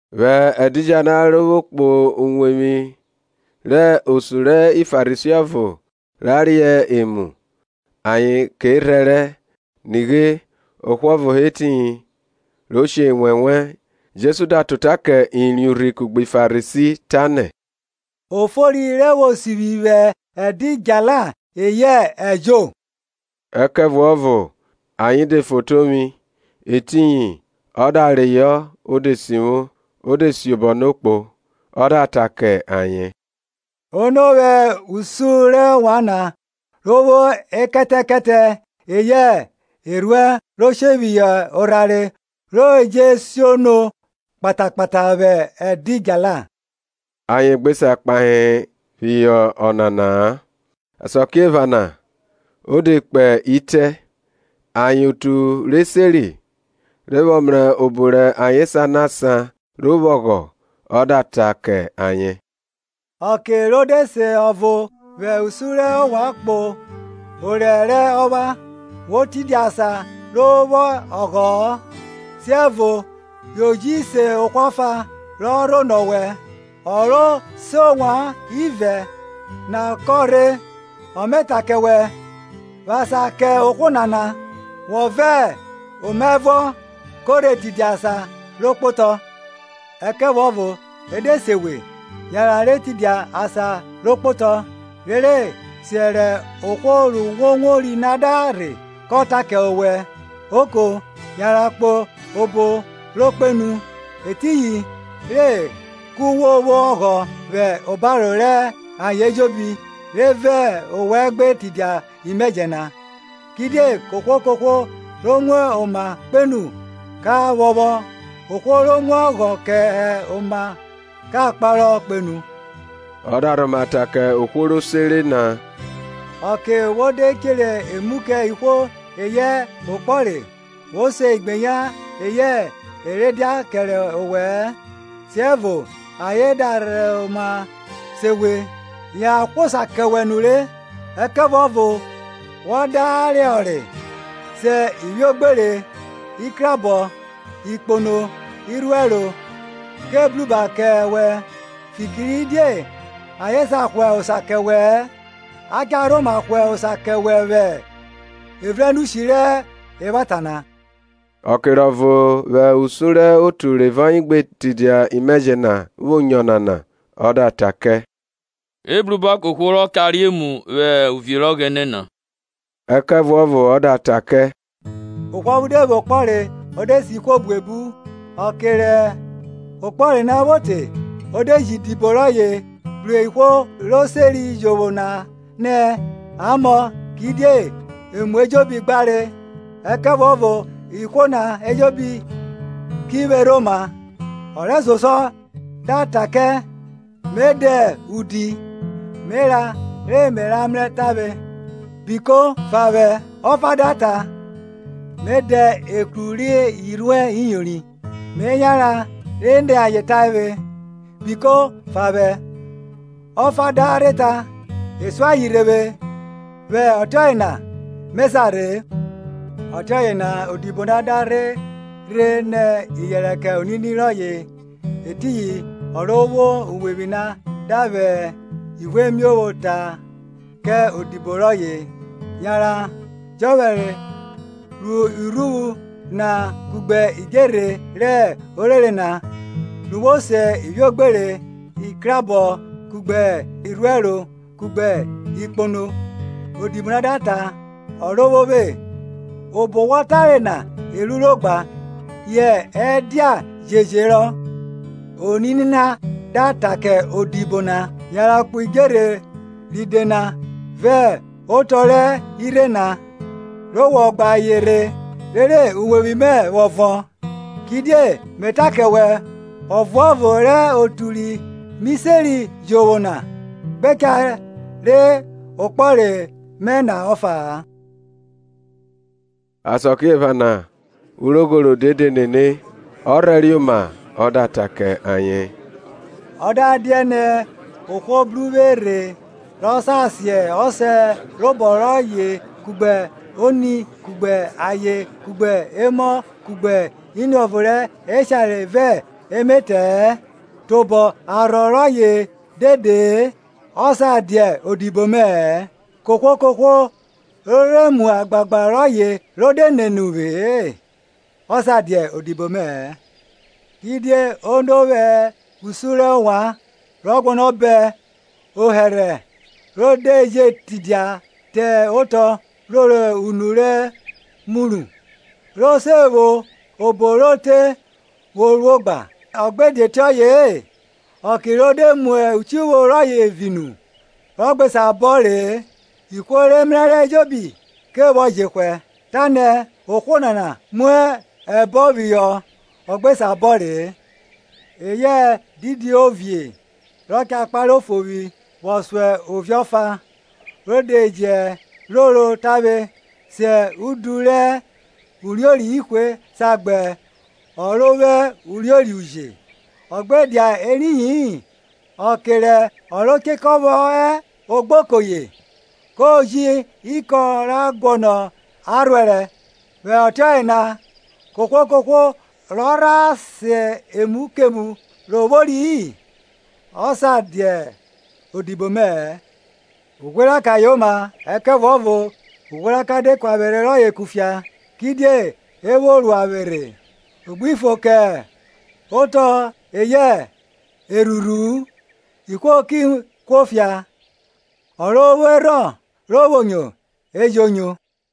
Vwẹ ẹdidjala ro vwo kpo uwevwi rẹ osun ri Farisi ọvo ra re emu, ayen ke rhẹrẹ. Nighe, ohwo ọvo hẹ etiyin ro she enwẹnwẹ. Jesu da ta ota kẹ eriẹn urhi kugbe Farisi, tanẹ, O fori re vwo sivwi vwẹ ẹdidjala, eyẹ ẹjo? Ẹkẹvuọvo ayen de fotovwi. Etiyin ọ da reyọ o de sivwo, o de siobọ no kpo. Ọ da ta kẹ ayen, Ono vwẹ usun rẹ ovwan na, ro vwo ekẹtẹkẹtẹ eyẹ erhuẹn ro she phihọ orhare, ro je siono kpatakpata vwẹ ẹdidjala? Ayen gbe sa kpahe phihọ ọnana-a. Asakiephana o de kpe itẹ ayen otu re seri, rọ vwọ mrẹ obo re ayen sanọ asan ro vwo ọghọ, o da ta kẹ ayen, Ọke re de se ọvo vwẹ usun rẹ ovwan kpo orẹ rẹ ọpha, wo tidia asan ro vwo ọghọ-ọ, siẹvo yo ji se ohwo ọfa rọ rhonọ owẹ; ọ ro se ovwan ivẹ na kọ rhe, ọ me ta kẹ wẹ, Vwẹ asan kẹ ohwo nana, wọ vẹ omaẹvuọ ko re tidia asan ro kpotọ. Ẹkẹvuọvo e de se we, yanran re tidia asan ro kpotọ, rere siẹ rẹ ohwo ru wo wori na da rhe kọ ta kẹ owẹ, Oko, yanran kpo obo ro kpenu; etiyin re ku wo vwo ọghọ vwẹ obaro rẹ ayen ejobi re vẹ owẹ gbe tidia imẹjẹ na. Kidie kohwo kohwo ro mu oma kpenu ka phọphọ, ohwo ro mu ọghọ kẹ oma ka kparọ kpenu. Ọ da rhoma ta kẹ ohwo ro sere na, Ọke wo de chere emu kẹ ihwo eyẹ okpọre, wo se igbeyan eyẹ e re dia kẹre owẹ-ẹ, siẹvo ayen da rhoma se wẹ, ya hwa osa kẹ wẹ nure. Ẹkẹvuọvo wẹ da re orẹ, se ivwiogbere, ikruabọ, ikpono, irhuẹro, ke bruba kẹ wẹn, fikiridie ayen sa hwa osa kẹ wẹ-ẹ. A cha rhoma hwa osa kẹ wẹ vwẹ evrenushi rẹ evwata na. Ọke rẹ ọvo vwẹ usun rẹ otu re vẹ ọye gbe tidia imẹjẹ na vwo nyo Ọnana, ọ da ta kẹ, Ebruba kẹ ohwo rọ cha re emu vwẹ uvie rẹ Ọghẹnẹ na. Ẹkẹvuọvo ọ da ta kẹ, Ohwo ọvo de vwo okpọre, o de se ihwo buebu; ọke rẹ okpọre na vwo te, o de ji idibo rọye bru ihwo ro seri jovwo na nẹ, A mọ; kidie emu ejobi gbare. Ẹkẹvuọvo ihwo na ejobi ki vwerhe oma. Ọ rẹsosuọ da ta kẹ, Me dẹ udju, me ra re me ra mrẹ tavwe; biko, fa vwẹ. Ọfa da ta, Me dẹ ekru rẹ irhuẹn iyori, Me yanran re ni ayen tavwe; biko, fa vwẹ. Ọfa da rha ta, E sun aye rhe vwe, vwẹ ọtiọye na me sa rhe-e. Ọtiọye na odibo na da rhe rhe nẹ iyẹnrẹ kẹ onini rọye. Etiyin ọ ro vwo uwevwi na da vwẹ ivuemiovwo ta kẹ odibo rọye, yanran jọphẹre ro irhuvwu na kugbe idjerhe rẹ orere na, ru wo se ivwiogbere, ikruabọ kugbe irhuẹro kugbe ikpono. Odibo na da ta, Ọrovwovwe, obo wọ tare na e ruro gba, yẹ ẹdia je jerọ. Onini na da ta kẹ odibo na, yanran kpo idjerhe ride na vẹ otọ rẹ irhe na, re wọ gba ayen rhe, rere uwevwi mẹ vwọ vọn. Kidie me ta kẹ wẹ, ọvuọvo rẹ otu ri mi seri jovwo na gbe cha re okpọre mẹ na ọfa-a. Asakiephana urogho rode de nene; ọ rhẹriẹ oma ọ da ta kẹ ayen, Ọ da dianẹ ohwo bru uvwe rhe ro sa sen ọsẹ robọ rọye kugbe oni kugbe aye kugbe emọ kugbe iniọvo rẹ eshare vẹ emetẹ-ẹ, tobọ arhọ rọye dede-e, ọ sa dia odibo mẹ-ẹ. Kohwo kohwo ro rhe mu agbagba rọye ro de nene uvwe-e, ọ sa dia odibo mẹ-ẹ. Kidie ono vwẹ usun rẹ ovwan, rọ guọnọ bọn ohẹrhẹ, ro de je tidia te otọ roro unu ro muru, so se vwo obo ro te vwo ruo gba? Ọ gbe dia ọtiọye-e, ọke ro de mu uchivwo rọye vi nu, rọ gbe sa bọn re-e, ihwo re mrẹrẹ ejobi ke vwọ jehwẹ, tanẹ, Ohwo nana mu ẹbọn phihọ ọ gbe sa bọn re-e. Eyẹ didi ovie, re cha kpare ofovwi vwọ so ovie ọfa, ro de je roro tavwe sẹ udu rẹ uriori ihwe sa gba ọ ro vwo uriori uje? Ọ gbe dia eriyi-in, ọke rẹ ọ ro chekọ vwọ hẹ ogboko ye, ko ji ikọn ra guọnọ arhuẹrẹ. Vwẹ ọtiọye na, kohwo kohwo rọ rha sen emu kemu ro vwori-i ọ sa dia odibo mẹ-ẹ. Ughweraka yoma; ẹkẹvuọvo ughweraka de ku avwerhe rọye kufia, kidie e vwo ruo vwerhe? O gbi fo kẹ otọ eyẹ erhurhu-u; ihwo ki kuo fia. Ọ ro vwo erhọn ro vwo nyo, e jo nyo.